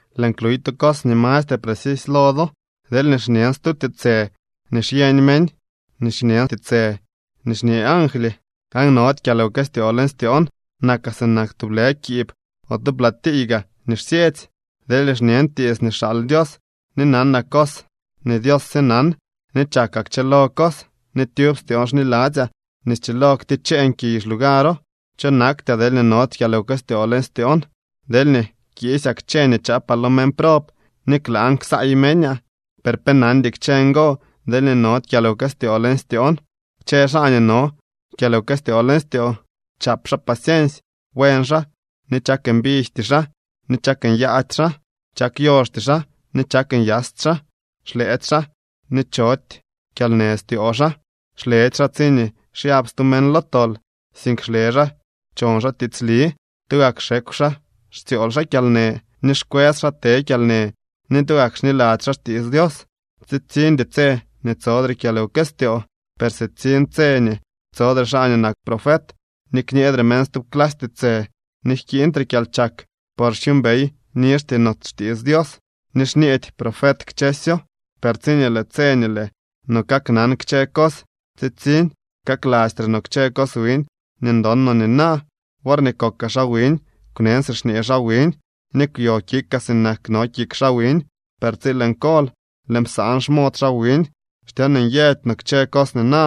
Lëën kluy tu cos nii mastre precisy lo do. Deelñee xñen stu tiitsë nii xyeñ meñ ni xñen tiitsë nii xñee angly, aan nody kyalwkëstyoo leñ styoon, nakaa sinak tublë kiib o tu platiiy gaa nii xsyetsy. Deelñee xñen tiits nii xaal Dios, ni nanaa cos nii Dios sye nan, ni chakaa kchëlo cos, ni tyub styoon xniladzyaa nii schilo kticheen kiy xlugaro, cho naktyaa deelñee nody kyalwkëstyoon leñ styoon. Deelñee kiisyaa kchë nii chaapaa lo meñ prob ni klaan ksaay meñaa, per pe nandy kchë ngo, deelñee nody kyalwkëstyoo leñ styoon. Kchë xaa nii no kyalwkëstyoo leñ styoo, chap xaa paciensy, buen xaa ni chak mbijty xaa ni chak nyaady xaa. Chak yoxty xaa ni chak nyasty xaa, xlëëdy xaa ni chody kyalnë styoo xaa. Xledy xaa tsiñee xyab stu meñ lo tol, sink xle xaa chon xaa tiitsli. Tugak xekw xaa xtsyool xaa kyalnë ni xkwës xaa te kyalnë ni tugak xniladzy xaa xtiits Dios. Tsitsiñdy tse nii tsodre kyalwkëstyoo, per sitsiñ tse nii tsodre xaa nii nak profet, ni kñeedre meñ stub clasy tiitsë, ni jkiiñtre kyalchak. Por xyuumbey nizhty no xtiits Dios, ni xñeedy profet kchësyo, per tsiñee lëë tse nii lëë no kaknan kchë cos, tsitsiñ ksalastre no kchë cos wiñ nii ndon no nina. Worñee kokaa xaa wiñ, kwnen si xñee xaa wiñ ni kwyo kikaa sinak no kik xaa wiñ, per tsi lëën kol, lëën psaan xmod xaa wiñ. Xtyon nyëdy no kchë cos nina.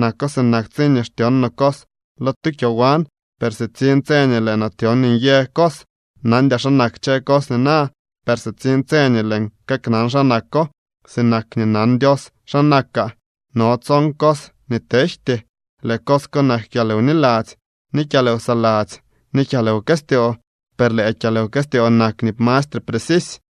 Nako sinak tsiñee xtyon no cos lo tu kyowan, per sitsiñ tse nii lëë no tyon nyë cos. Nandyaa xa nak kchë cos nina, per sitsiñ tse nii lëën kaknan xa nako, sinak nii nan Dios xa nakaa. No tson cos nii tejty, lëë cos ko nak kyalwniladzy, ni kyalwsaladzy ni kyalwkëstyoo, per lëë kyalwkëstyoo nak nii mastre precisy.